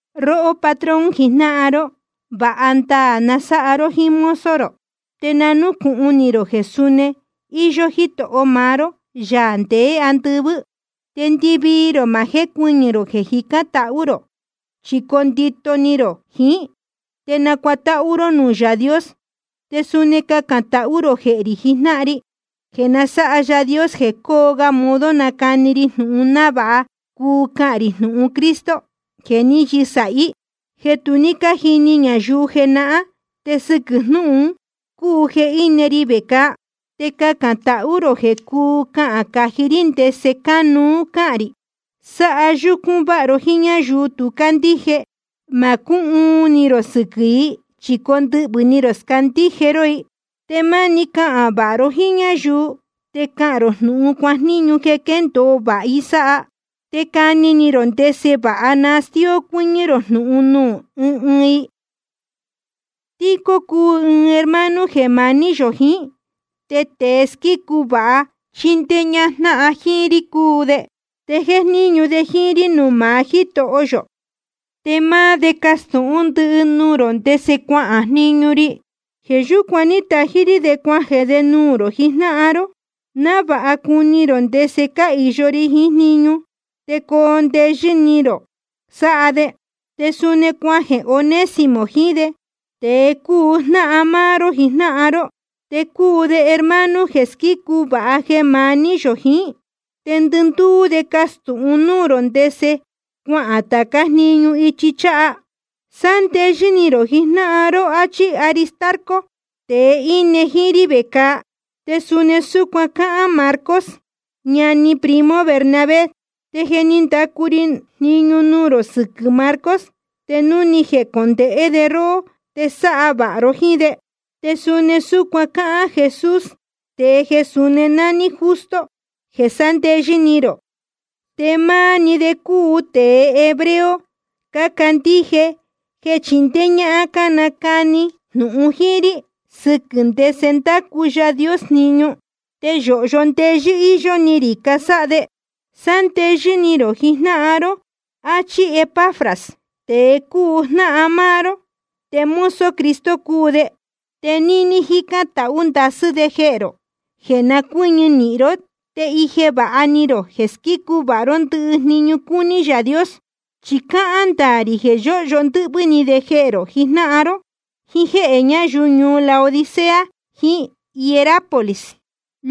Róhó patrón jijnáhan ró, vāha ndaā na sáha ró jíín mozo rō. Te na núcūhun ni rō jeē suni íyó Jítoho maá ró, Yaā ndeé andɨvɨ́. Te ndɨvii rō ma jécuɨñɨ̄ rō jeē jicán tahú rō, chi coo ndito ni rō jiín, te nacuatáhú ró núū Yaā Dios. Te suni cacān tahú rō jehē rī jijnáhan ri, jeē na sáha Yaā Dios jeē cóo ga modo nacani ri jnūhun, návāha cuu cahān rī jnūhun Cristo jeē ní yɨsāhí, jeē tu ní cájini ñayuu jenahán. Te sɨquɨ̄ jnúhun un cúu jeē íne ri vecāa. Te cacān tahú rō jeē cuu cahān cají rí ndese cánuú cáhān rī. Sáha yúcún váha ró jiín ñáyuu tu cácandíje. Ma cúhuun ni rō sɨquɨ̄ i, chi condɨhvɨ̄ ni rō scandíje ró i. Te máni cahān vāha ró jíín ñáyuu, te cahān rō jnūhun cuajníñu jeē quéndōo vāha i sáha. Te cani ni rō ndese vāha nastíó cuɨ́ñɨ́ rō jnūhun nuū ɨɨn ɨɨn i. Tíquico cúu ɨɨn hermano jeē maní yō jiín, te tēe squícu vāha chíndéé ñájnáhan jíín rí cúu de, te jéjníñu de jíín rí nuū maá Jítoho yō. Te máá de castūhún ndɨhɨ nuū rō ndese cuahān jniñu ri. Jeē yúcuan ní tají rí de cuajeē de nuū rō jijnáhan ró, návāha cuni rō ndese cáhīyo ri jiín jniñu, te coo ndeyɨ́ ni rō sáha de. Te suni cuajeē Onésimo jiín de, tēe cúu jnáhan máá ró jijnáhan ró. Te cúu de hermano jeē squícu vāha jeē maní yō jiín. Te ndɨndúú de castūhun núū rō ndese cuahān tācá jniñu ichi cháha. Sándeyɨ́ ni rō jijnáhan ró, áchí Aristarco, tēe íne jíín rí vecāa. Te suni súcuan cáhán Marcos, ñani primo Bernabé. Te je ni ndacu ri jniñu nuū rō sɨquɨ̄ Marcos, te núu ni jecondēhé de róhó te sáha vāha ró jíín de. Te suni súcuan cáhán Jesús, tēe jeē suni nání Justo, jeē sándeyɨ́ ni rō. Te máá‑ni de cácuu tēe hebreo cácandíje jeē chindéé ñáhán cánacani jnūhun jíín rí sɨquɨ̄ ndese ndácu Yaā Dios jniñu. Te yōhyo ndeyɨ́ íyó ni rī casáha de. Sándeyɨ́ ni rō jijnáhan ró, áchí Epafras, tēe cúu jnáhan máá ró, te mozo Cristo cúu de. Te níní jícán tahú ndasɨ́ de jehē rō, jeē na cuɨ́ñɨ nīhin ró, te ije vāha ni rō jeē squícu vāha ró ndɨhɨ jniñu cúní Yaā Dios. Chi cáhán ndaā rī jeē yóhyo ndɨ́hvɨ́ ni de jehē rō jijnáhan ró, jíín jéhē ñáyuu ñuu Laodicea jiín Hierápolis.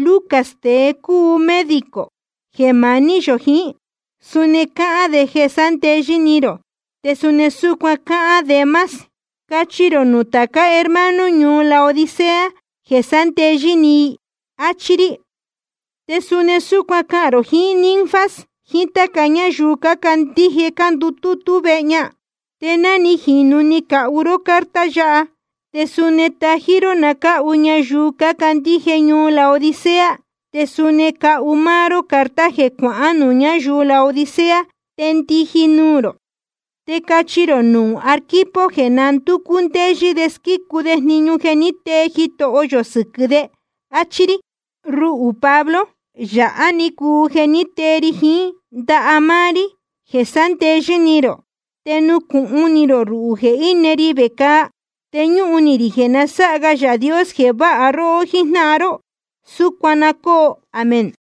Lucas, tēe cúu médico jeē maní yō jiín, suni cáhán de jeē sándeyɨ́ ni rō, te suni súcuan cáhán Demas. Cachi rō nuū tācá hermano ñuu Laodicea jeē sándeyɨ́ ni i, áchí rí. Te suni súcuan cahān rō jiín Ninfas, jíín táca ñáyuu cácandíje cándutútú vehe ña. Te ná ni jīnu ni cacahu ró carta yáha, te suni tají ró na cáhu ñayuu cácandíje ñuu Laodicea. Te suni cahu máá ró carta jeē cuahán nuū ñáyuu Laodicea te ndiji nuū rō. Te cachi rō nuū Arquipo jeē na ndúcú ndéyɨ́ de squícu de jniñu ní tee Jitoho yō sɨquɨ̄ de, áchí rí. Ruhū Pablo, yāhá‑ni cúu jeē tée ri jiín ndaha máá rí, jeē sándeyɨ́ ni rō. Te nucūhun ni rō ruhū jeē íne ri vecāa. Te ñúhun ni rī jeē na sáha ga Yaā Dios jeē váha róhó jíjnáhan ró. Súcuan na cóo. Amén.